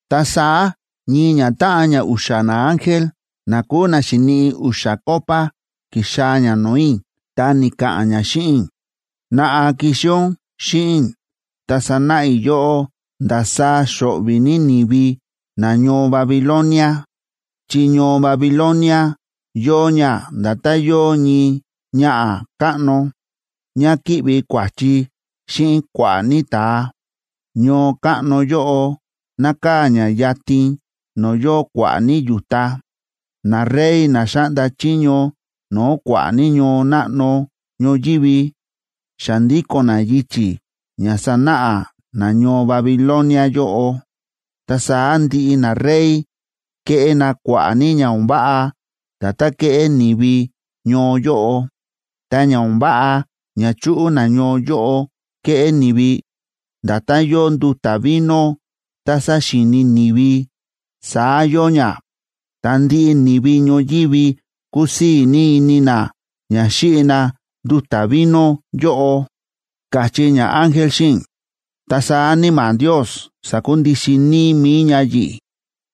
Ta saá ñii ñatáꞌan na u̱xa̱ naángel na kúu na xi̱niꞌi u̱xa̱ copa ki̱xaa̱ ña no̱o̱ i̱, ta ni̱ka̱ꞌa̱n ña xíꞌin i̱: ―Naꞌa, kixi ún xíꞌin i̱, ta sanáꞌa i̱ yóꞌó ndasaá xo̱ꞌvi̱ ní ni̱vi nañoo Babilonia, chi ñoo Babilonia yóo ña nda̱tán yóo ñii ñaꞌa̱ káꞌno, ñá kíꞌvi kua̱chi xíꞌin kua̱ꞌa̱ ní ta̱a. Ñoo káꞌno yóꞌo nákaa̱ ña yatin no̱o̱ yóo kua̱ꞌa̱ ní yu̱ta. Narey na xáꞌnda chiño no̱o̱ kua̱ꞌa̱ ní ñoo náꞌno ñoyívi xa ndíko̱n na yichi̱ ña sánáꞌa nañoo Babilonia yóꞌo, ta saá ndiꞌi narey ke̱ꞌé na kua̱ꞌa̱ ní ña o̱n váꞌa, nda̱tán ke̱ꞌé ni̱vi ñoo yóꞌo. Ta ña o̱n váꞌa ña chúꞌu nañoo yóꞌo keꞌé ni̱vi, nda̱tán yóo nduta̱ vino tá sáxíini ni̱vi, saá yóo ña. Ta ndiꞌi ni̱vi ñoyívi kúsii̱ ní ini na ña xíꞌi na nduta̱ vino yóꞌo ―káchí ñaángel xíꞌin i̱. Ta saá Níma̱ Ndios sa̱kundixin níí mi̱i ña yi̱ꞌi̱,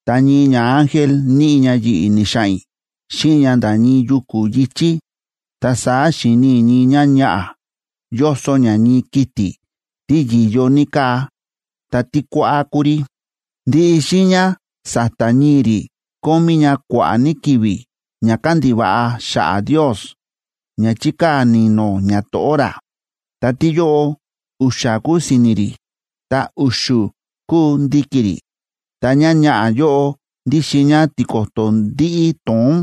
ta ñii ñaángel níꞌi ña yi̱ꞌi̱ ni̱xa̱ꞌa̱n i̱ xíꞌin ña nda̱ ñii yuku̱ yi̱chí. Ta saá xi̱ni i̱ ñii ñáñaꞌa̱, yóso ñá ñii kiti̱ tí yi̱yo ní káa, tí kuáꞌá kúu rí. Ndiꞌi xiiña sa̱ta̱ ñii̱ rí kómí ña kua̱ꞌa̱ ní ki̱vi̱ ña kándiva̱ꞌa xa̱ꞌa̱ Ndios ña chíkaa̱ ni̱no̱ ñato̱ꞌó ra. Ta tíyóꞌo, u̱xa̱ kúu si̱ni̱ rí, ta u̱xu̱ kúu ndi̱ki̱ rí. Ta ñáñaꞌa̱ yóꞌo ndíxin ñá tiko̱to̱ ndíꞌí to̱ón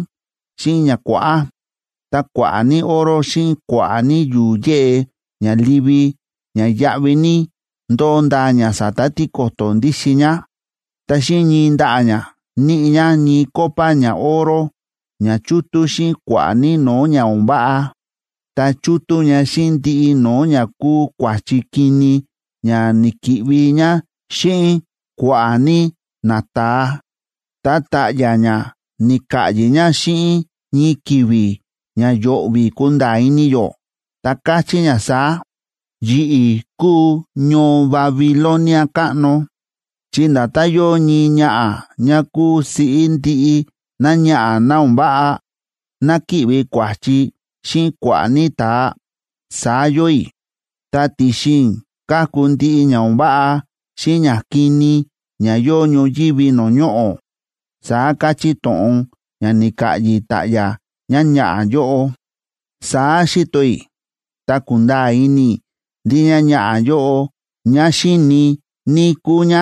xíꞌin ña kuáꞌá. Ta kua̱ꞌa̱ ní oro xíꞌin kua̱ꞌa̱ ní yu̱u̱ yéꞌe ña livi ña yáꞌví ní, ndóo ndaa ña sa̱ta̱ tiko̱to̱ ndíxin ñá. Ta xíꞌin ñii ndaꞌa̱ ña, níꞌi ña ñii copa ñaoro ña chútú xíꞌin kua̱ꞌa̱ ní no̱o̱ ña o̱n váꞌa, ta chútú ña xíꞌin ndiꞌi no̱o̱ ña kúu kua̱chi kini ña ni̱ki̱ꞌvi ñá xíꞌin kua̱ꞌa̱ ní nata̱a. Ta ta̱ꞌya̱ ñá ni̱ka̱ꞌyi̱ ña xíꞌin ñii ki̱vi̱ ña yo̱ꞌvi̱ kunda̱a̱ ini yó, ta káchí ña saá: “Yi̱ꞌi̱ kúu ñoo Babilonia káꞌno, chi nda̱tán yóo ñii ñaꞌa̱ ñá kúu siꞌí ndiꞌi náñaꞌa̱ ná o̱n váꞌa, ná kíꞌvi kua̱chi xíꞌin kua̱ꞌa̱ ní ta̱a, saá yóo i̱, ta ti̱xin i̱ káku ndiꞌi ña o̱n váꞌa xíꞌin ñakini ña yóo ñoyívi no̱o̱ ñoꞌo̱”, saá káchí to̱ꞌon ña ni̱ka̱ꞌyi̱ ta̱ꞌya̱ ñáñaꞌa̱ yóꞌo. Saá xi̱to i̱, ta ku̱nda̱a̱ ini i̱ ndí ñáñaꞌa̱ yóꞌo ñá xíini ní kúu ñá,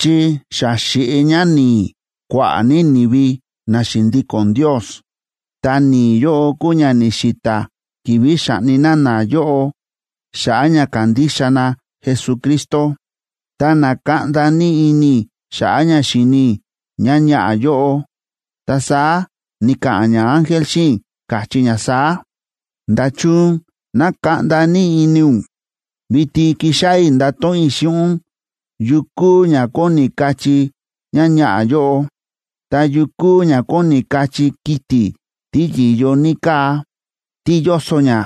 chi xa xi̱ꞌi ñá ni̱i̱ kua̱ꞌa̱ ní ni̱vi na xi̱ndíko̱n Ndios, ta ni̱i̱ yóꞌo kúu ña ni̱xi̱ta̱ ki̱vi̱ xa̱ꞌni na nayóꞌo xa̱ꞌa̱ ña kándixa na Jesucristo. Ta na̱kaꞌnda ní ini i̱ xa̱ꞌa̱ ña xi̱ni i̱ ñáñaꞌa̱ yóꞌo. Ta saá ni̱ka̱ꞌa̱n ñaángel xíꞌin i̱, káchí ña saá: ―¿Nda̱chun na̱kaꞌnda ní ini ún? Vitin kixáꞌá i̱ ndato̱ꞌon i̱ xíꞌin ún yu kúu ña kóni kachí ñáñaꞌa̱ yóꞌo, ta yu kúu ña kóni kachí kiti̱ tí yi̱yo ní káa, tí yóso ñá,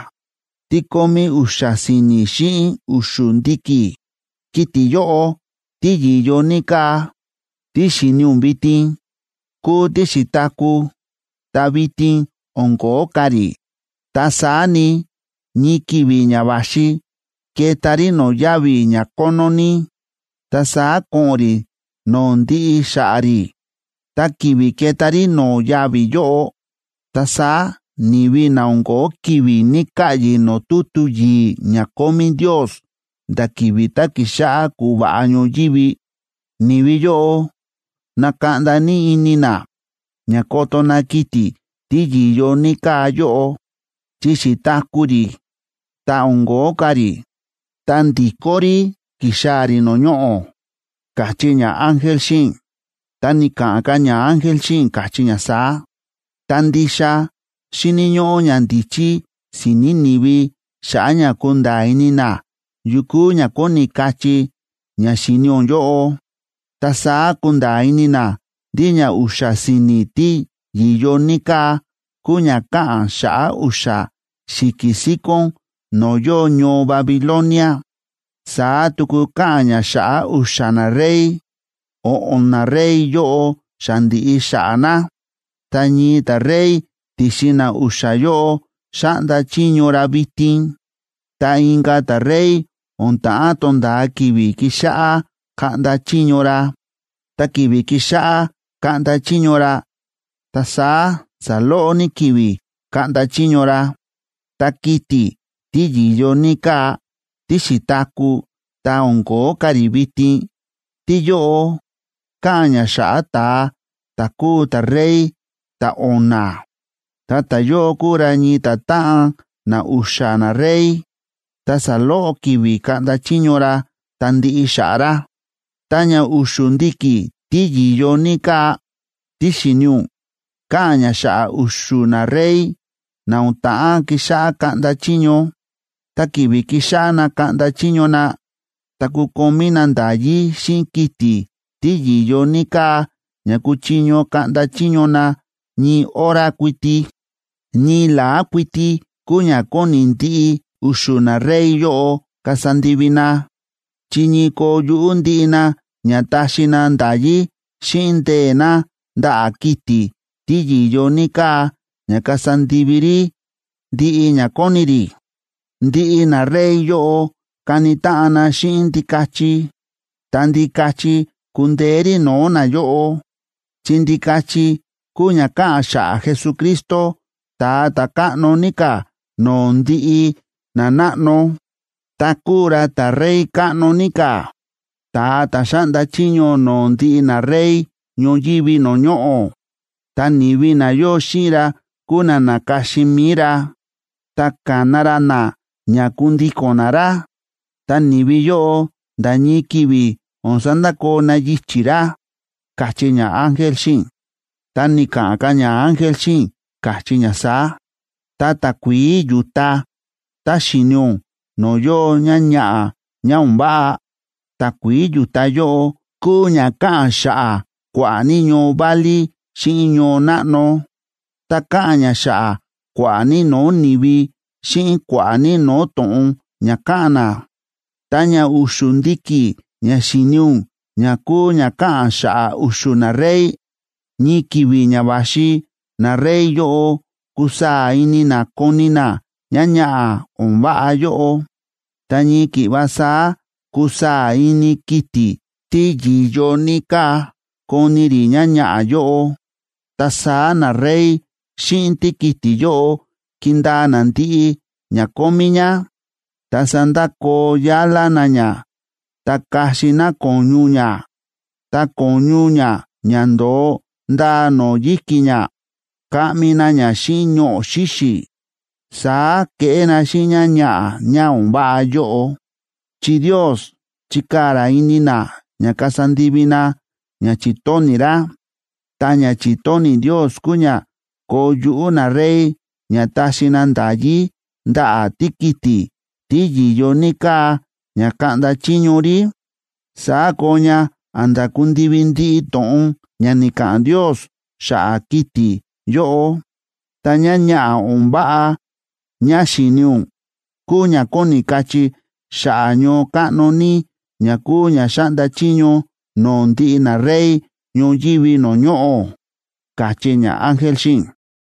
tí kómí u̱xa̱ si̱ni̱ xíꞌin u̱xu̱ ndi̱ki̱. Kiti̱ yóꞌo tí yi̱yo ní káa, tí xi̱ni ún vitin, kúu tí xi̱taku̱, ta vitin o̱n ko̱ó ka̱ rí. Ta saá ni, ñii ki̱vi̱ ña va̱xi keta rí no̱o̱ yavi̱ ña kónó ní, ta saá ko̱ꞌo̱n rí no̱o̱ ndiꞌi xa̱ꞌa̱ rí. Ta ki̱vi̱ keta rí no̱o̱ yavi̱ yóꞌo, ta saá ni̱vi na o̱n ko̱ó ki̱vi̱ ni̱ka̱ꞌyi̱ no̱o̱ tutu yi̱i̱ ña kómí Ndios nda̱ ki̱vi̱ tá ki̱xáꞌá kúva̱ꞌa ñoyívi, ni̱vi yóꞌo nakaꞌnda ní ini na, ña koto na kiti̱ tí yi̱yo ní káa yóꞌo, chi xi̱taku̱ rí ta o̱n ko̱ó ka̱ rí, ta ndi̱kó rí ki̱xaa̱ rí no̱o̱ ñoꞌo̱ ―káchí ñaángel xíꞌin i̱. Ta ni̱ka̱ꞌa̱n ka̱ ñaángel xíꞌin i̱, káchí ña saá: ―Ta ndixa xíni̱ ñóꞌó ñandíchí si̱ni̱ ni̱vi xa̱ꞌa̱ ña kunda̱a̱ ini na yu kúu ña kóni kachí ña xíni ún yóꞌo. Ta saá kunda̱a̱ ini na ndí ña u̱xa̱ si̱ni̱ tí yi̱yo ní káa kúu ña káꞌa̱n xa̱ꞌa̱ u̱xa̱ xi̱ki̱ síkón no̱o̱ yóo ñoo Babilonia. Saá tuku káꞌa̱n ña xa̱ꞌa̱ u̱xa̱ narey. O̱ꞌo̱n narey yóꞌo xa ndi̱ꞌi xa̱ꞌa̱ na, ta ñii ta̱rey ti̱xin na u̱xa̱ yóꞌo xáꞌnda chiño ra vitin. Ta inka̱ ta̱rey o̱n ta̱ꞌán tonda̱a ki̱vi̱ kixáꞌá kaꞌnda chiño ra. Tá ki̱vi̱ kixáꞌá kaꞌnda chiño ra, ta saá saloꞌo ní ki̱vi̱ kaꞌnda chiño ra. Ta kiti̱ tí yi̱yo ní káa, tí xi̱taku̱ ta o̱n ko̱ó ka̱ rí vitin, tíyóꞌo káꞌa̱n ña xa̱ꞌa̱ ta̱a ta̱ kuu ta̱rey ta̱o̱na̱. Ta ta̱yóꞌo kuu ra ñii ta̱táꞌan na u̱xa̱ narey, ta saloꞌo ki̱vi̱ kaꞌnda chiño ra, ta ndiꞌi xa̱ꞌa̱ ra. ’Ta ña u̱xu̱ ndi̱ki̱ tí yi̱yo ní káa, tí xi̱ni ún, káꞌa̱n ña xa̱ꞌa̱ u̱xu̱ narey na o̱n ta̱ꞌán kixáꞌá kaꞌnda chiño. Ta ki̱vi̱ kixáꞌá na kaꞌnda chiño na, ta kukomí na nda̱yí xíꞌin kiti̱ tí yi̱yo ní káa ña kuchiño kaꞌnda chiño na ñii hora kuiti. Ñii la̱á kuiti kúu ña kóni ndiꞌi u̱xu̱ narey yóꞌo kasa ndivi na, chi ñii koo yuꞌú ndiꞌi na ña taxi na nda̱yí xíꞌin ndee̱ na ndaꞌa̱ kiti̱ tí yi̱yo ní káa ña kasa ndivi rí ndiꞌi ña kóni rí. Ndiꞌi narey yóꞌo kani táꞌan na xíꞌin Ndikachi, ta Ndikachi kundeé rí no̱o̱ nayóꞌo, chi Ndikachi kúu ña káꞌa̱n xa̱ꞌa̱ Jesucristo, Ta̱a Ta̱káꞌno ní ka̱ no̱o̱ ndiꞌi nanáꞌno, ta kúu ra ta̱Rey káꞌno ní ka̱, ta̱a ta̱ xáꞌnda chiño no̱o̱ ndiꞌi narey ñoyívi no̱o̱ ñoꞌo̱. Ta ni̱vi na yóo xíꞌin ra kúu na na̱ka̱xin mi̱i ra, ta ka̱na ra na ña kundíko̱n na ra. Ta ni̱vi yóꞌo nda̱ ñii ki̱vi̱ o̱n sandakoo na yichi̱ ra ―káchí ñaángel xíꞌin i̱. Ta ni̱ka̱ꞌa̱n ka̱ ñaángel xíꞌin i̱, káchí ña saá: ―Ta takuií yu̱ta tá xi̱ni ún no̱o̱ yóo ñáñaꞌa̱ ñá o̱n váꞌa, takuií yu̱ta yóꞌo kúu ña káꞌa̱n xa̱ꞌa̱ kua̱ꞌa̱ ní ñoo válí xíꞌin ñoo náꞌno, ta káꞌa̱n ña xa̱ꞌa̱ kua̱ꞌa̱ ní no̱o̱ ni̱vi, xíꞌin kua̱ꞌa̱ ní no̱o̱ to̱ꞌon ña káꞌa̱n na. Ta ña u̱xu̱ ndi̱ki̱ ña xi̱ni ún ña kúu ña káꞌa̱n xa̱ꞌa̱ u̱xu̱ narey, ñii ki̱vi̱ ña va̱xi narey yóꞌo kusaa̱ ini na koni na ñáñaꞌa̱ o̱n váꞌa yóꞌo. Ta ñii ki̱ꞌva saá kusaa̱ ini kiti̱ tí yi̱yo ní káa koni rí ñáñaꞌa̱ yóꞌo. Ta saá narey xíꞌin tíkiti̱ yóꞌo kindaa na ndiꞌi ña kómí ñá, ta sandakoo yálá na ñá, ta kaxi na ko̱ñu ñá. Ta ko̱ñu ñá ña ndo̱o ndaa no̱o̱ yi̱ki̱ ñá, kaꞌmi na ña xíꞌin ñoꞌo̱ xíxi̱. Saá keꞌé na xíꞌin ñáñaꞌa̱ ñá o̱n váꞌa yóꞌo, chi Ndios chikaa̱ ra ini na ña kasa ndivi na ña chi̱tóni̱ ra. Ta ña chi̱tóni̱ Ndios kúu ña koo yuꞌú narey ña taxi na nda̱yí ndaꞌa̱ tíkiti̱ tí yi̱yo ní káa ña kaꞌnda chiño rí. Saá koo ña a̱nda̱ kundivi ndiꞌi to̱ꞌon ña ni̱ka̱ꞌa̱n Ndios xa̱ꞌa̱ kiti̱ yóꞌo. Ta ñáñaꞌa̱ ñá o̱n váꞌa ñá xi̱ni ún, kúu ña kóni kachí xa̱ꞌa̱ ñoo káꞌno ní ña kúu ña xáꞌnda chiño no̱o̱ ndiꞌi narey ñoyívi no̱o̱ ñoꞌo̱ ―káchí ñaángel xíꞌin i̱.